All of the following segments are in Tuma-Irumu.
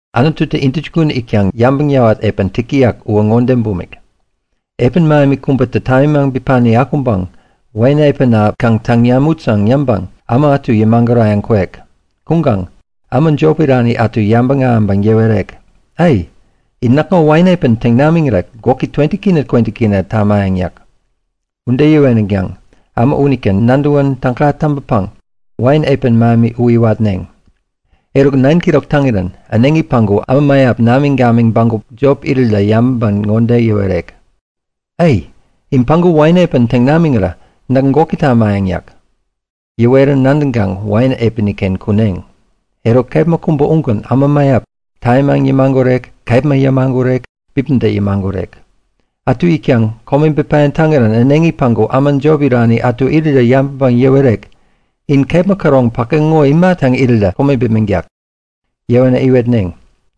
Anututä intäjukun itkaŋ yabäŋ yäwat epän täk täyak uwä ŋode bumik; Epän mähemi kubätä tamimaŋ bipani akuŋpäŋ wain epäna kaŋ täŋ namut yäŋ yäŋpäŋ äma ätu yämagurayäŋ kwek. Kuŋkaŋ äma jop irani ätu yabäŋ ahäŋpäŋ yäwerek; Ai! In näkŋo wain epän täŋ namiŋirä gwäki K20 K20 tamayäŋ yäk. Ude yäweränkaŋ äma unitä nadäwä täga täŋpäpäŋ wain epän mähemi u iwatneŋ. Eruk 9'kirok täŋirän äneŋi päŋku äma mäyap namiŋ-gamiŋ bägup-ken jop irirä yabäŋpäŋ ŋode yäwerek; Ai, in päŋku wain epän täŋ namiŋirä näk gwäki tamayäŋ yäk. Yäwerän nadäŋkaŋ wain epäni-ken kuneŋ. Eruk kepma kubä ugän äma mäyap, tamimaŋ yämagurek, kepma yämagurek, bipäda yämagurek. Ätu itkaŋ kome bipayäŋ täŋirän äneŋi päŋku äma jop irani ätu irirä yabäŋpäŋ yäwerek; In kepma käroŋ päke ŋo ima täŋ irirä kome bipmäŋtak? Yäwänä iwetneŋ;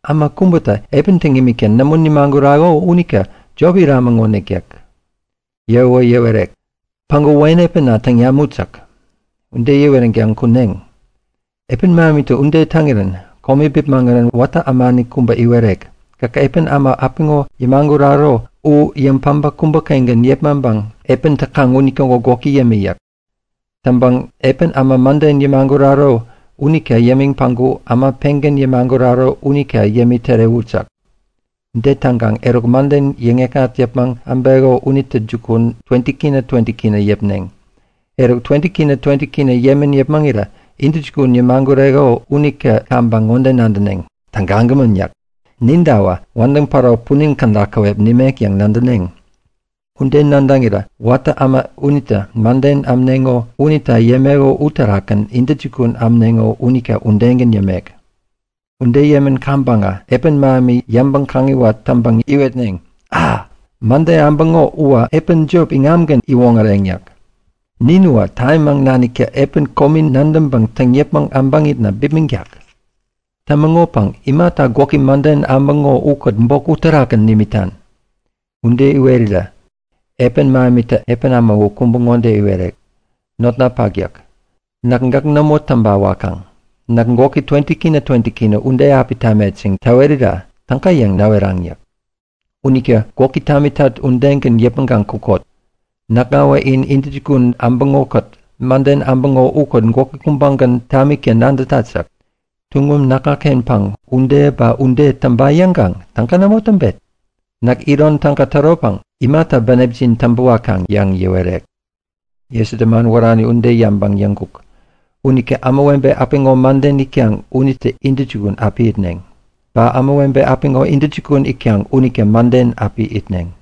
Äma kubätä epän täŋ imikta nämo nimagurako unita jop iramäŋonik yäk. Yäwäwä yäwerek; Päŋku wain epäna täŋ namut yäk. Ude yäweränkaŋ kuneŋ. Epän mähemitä ude täŋirän kome bipmäŋirän watä ämani kubä iwerek; Gäk epän äma apiŋo yämaguraro u yäŋ-päbä kubä-kengän yepmaŋpäŋ epän täkaŋ unitäŋo gwäki yämi yäk. Täŋpäŋ epän äma mäden yämaguraro unita yämiŋ päŋku äma pengän yämaguraro unita yämi tärewut yäk. Ude täŋkaŋ eruk mäden yäŋ-yäkŋat yäpmäŋ äbeko unitä jukun K20 K20 yäpneŋ. Eruk, K20 K20 yämän yäpmäŋirä intäjukun yämagureko unitä kaŋpäŋ ŋode nadäneŋ; Tägagämän! yäk. Nintawä wädäŋ päro punin käda käwep nimek yäŋ nadäneŋ. Ude nadäŋirä watä äma unitä mäden ämneŋo unita yämeko uterakgän intäjukun ämneŋo unita udegän yämek. Ude yämän kaŋpäŋä epän mähemi yäŋpäŋ-kaŋiwat täŋpäŋ iwetneŋ; A! Mäden äbäŋo uwä epän jop iŋamgän iwoŋäreŋ yäk. Nin uwä tamimaŋ naniktä epän komi nadäŋpäŋ täŋ yäpmäŋ äbäŋitna bipmäŋtak. Tämäŋopäŋ imata gwäki mäden äbäŋo ukät bok uterakgän nimitan? Ude iwerirä epän mähemitä epän äma u kubä ŋode iwerek; Notnapak yäk. Näkä gäk nämo täŋpa wakaŋ. Näk gwäki K20 K20 ude api tamet yäŋ täwerat. Täwerira täga yäŋ näweraŋ yäk. Unita gwäki tamitat udegän yäpmäŋkaŋ kukot. Näkŋawä in intäjukun äbäŋo-kät mäden äbäŋo ukät gwäki kubägän tamikta nadätat yäk. Tuŋum näkŋa-kenpäŋ ude ba ude täŋpa yäŋkaŋ täga nämo täŋpet? Näk iron täga täropäŋ imata bänepjin täŋpä wakaŋ? yäŋ yäwerek. Jesutä man wärani ude yäŋpäŋ yäŋkuk; Unita ämawebe apiŋo mäden itkaŋ unitä intäjukun api itneŋ. Ba ämawebe apiŋo intäjukun itkaŋ unitä mäden api itneŋ.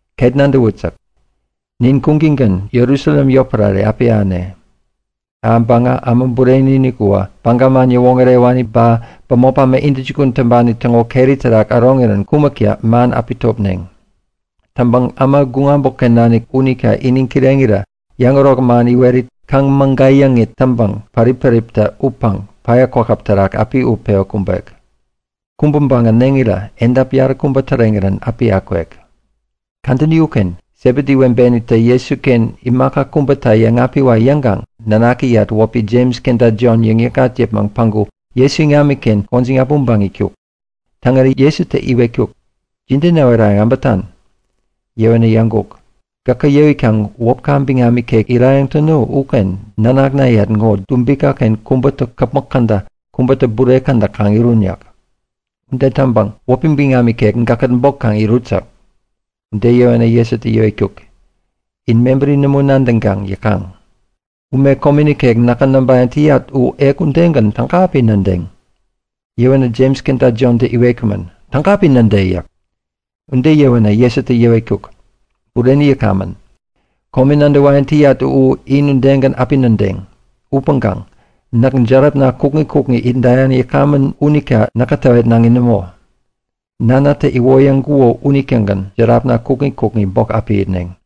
Ket nadäwut yäk. Nin kuŋtäŋgän Jerusalem yotpärare api ahäne. Ahäŋpäŋä Äma Bureni-inik uwä Baga man yäwoŋärewani ba bämop äma intäjukun täŋpani täŋo keri terak äroŋirän kumäkta man api topneŋ. Täŋpäŋ äma guŋ äbotken nanik unita iniŋ kireŋirä yäŋärok man iwerit, kaŋ-mägayäŋit täŋpäŋ pärip-päriptä utpäŋ päya kwakäp terak api utpewä kumbek. Kumbänpäŋ äneŋirä edap yaräkubä täreŋirän api akwek. Kadäni uken Sebedi webenitä Jesuken imaka kubäta yäŋapiwa yäŋkaŋ nanakiyat wäpi Jems kenta Jon yäŋ-yäkŋat yäpmäŋ päŋku Jesu iŋamiken gwäjiŋ äpmoŋpäŋ itkuk. Täŋirän Jesutä iwetkuk; Jide näwerayäŋ äbätan? Yäwänä yäŋkuk; Gäkä yäwikaŋ wäpka biŋam ikek irayäŋ täno uken nanaknayat ŋo dubika-ken kubätä käpmäk käda, kubätä bure käda kaŋ irun yäk. Ude täŋpäŋ wäpi biŋam ikek gäkkät bok kaŋ irut yäk. Ude yäwänä Jesutä yäwetkuk; In mebäri nämo nadäŋkaŋ yäkaŋ. Ume komi nikek näkä näŋpayäŋ täyat u ek udegän täga api nädeŋ? Yäwänä Jems kenta Jontä iwetkumän; Täga api näde! yäk. Ude yäwänä Jesutä yäwetkuk; Bureni yäkamän. Komi nadäwayäŋ täyat u in udegän api nadädeŋ. Upäŋkaŋ näk järapna kukŋi kukŋi itdayäŋ yäkamän unita näkä täwetnaŋi nämo. Nanatä iwoyäŋkuko unitägän järapna kukŋi kukŋi bok api itneŋ.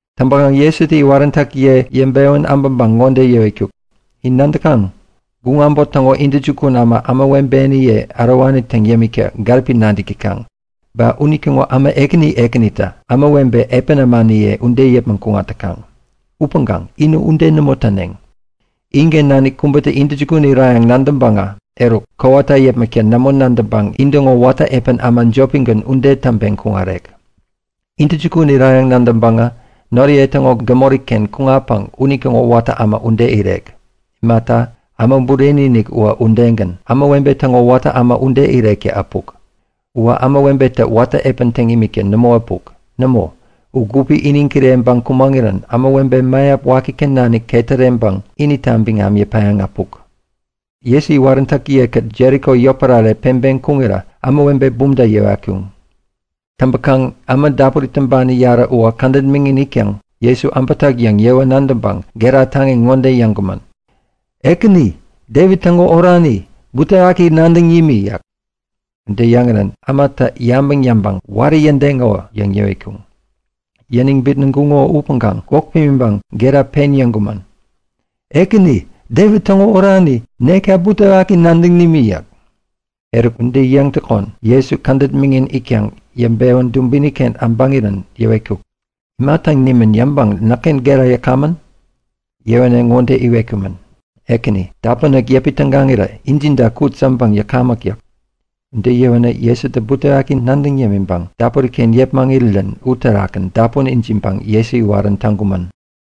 Täŋpäkaŋ Jesutä iwaräntäkiye yäŋpewän äbäpäŋ ŋode yäwetkuk; In nadäkaŋ? Guŋ äbot täŋo intäjukun ämatä ämawebeniye ärowani täŋ yämikta gäripi nadäk täkaŋ. Ba unitäŋo äma ekäni ekänitä ämawebe epän ämaniye ude yäpmäŋ kuŋat täkaŋ. Upäŋkaŋ inä ude nämo täneŋ. Inken nanik kubätä intäjukun irayäŋ nadäŋpäŋä eruk, kowata yäpmäkta nämo nadäŋpäŋ intäŋo watä epän äma jopigän ude täŋpeŋ kuŋarek. Intäjukun irayäŋ nadäŋpäŋä noriye täŋo gämori-ken kuŋatpäŋ unitäŋo watä äma ude irek. Imata, Äma Bureni-inik uwä udegän, ämawebe täŋo watä äma ude irekta äpuk. Uwä ämawebetä watä epän täŋ imikta nämo äpuk. Nämo! U gupi iniŋ kireŋpäŋ kumäŋirän ämawebe mäyap wakiken nanik ketäreŋpäŋ inita biŋam yäpayäŋ äpuk. Jesu iwaräntäkiye-kät Jeriko yotpärare peŋpeŋ kuŋirä ämawebe bumta yäwatkuŋ. Täŋpäkaŋ äma dapuri tumbani yarä uwä kädet miŋin itkaŋ Jesu äbätak yäŋ yäwä nadäŋpäŋ gera taŋi ŋode yäŋkumän; Ekäni, Devit täŋo orani, butewaki nadäŋ nimi! yäk. Ude yäŋirän ämatä yabäŋ yäŋpäŋ Wari yädeŋo! yäŋ yäwetkuŋ. Yäniŋ bitnäŋkuŋo upäŋkaŋ gwäk pimiŋpäŋ gera pen yäŋkumän; Ekäni, Devit täŋo orani, nekta butewaki nadäŋ nimi yäk. Eruk ude yäŋtäkon Jesu kädet miŋin itkaŋ yäŋpewän dubini-ken äbäŋirän yäwetkuk; Ima täŋ nimän yäŋpäŋ näkken gera yäkamän? Yäwänä ŋode iwetkumän; Ekäni, dapunek yäpi tägaŋirä ijida kut yäŋpäŋ yäkamäk yäk. Ude yäwänä Jesutä butewaki nadäŋ yämiŋpäŋ dapuri-ken yepmäŋirirän uterakgän dapun ijiŋpäŋ Jesu iwarän täŋkumän.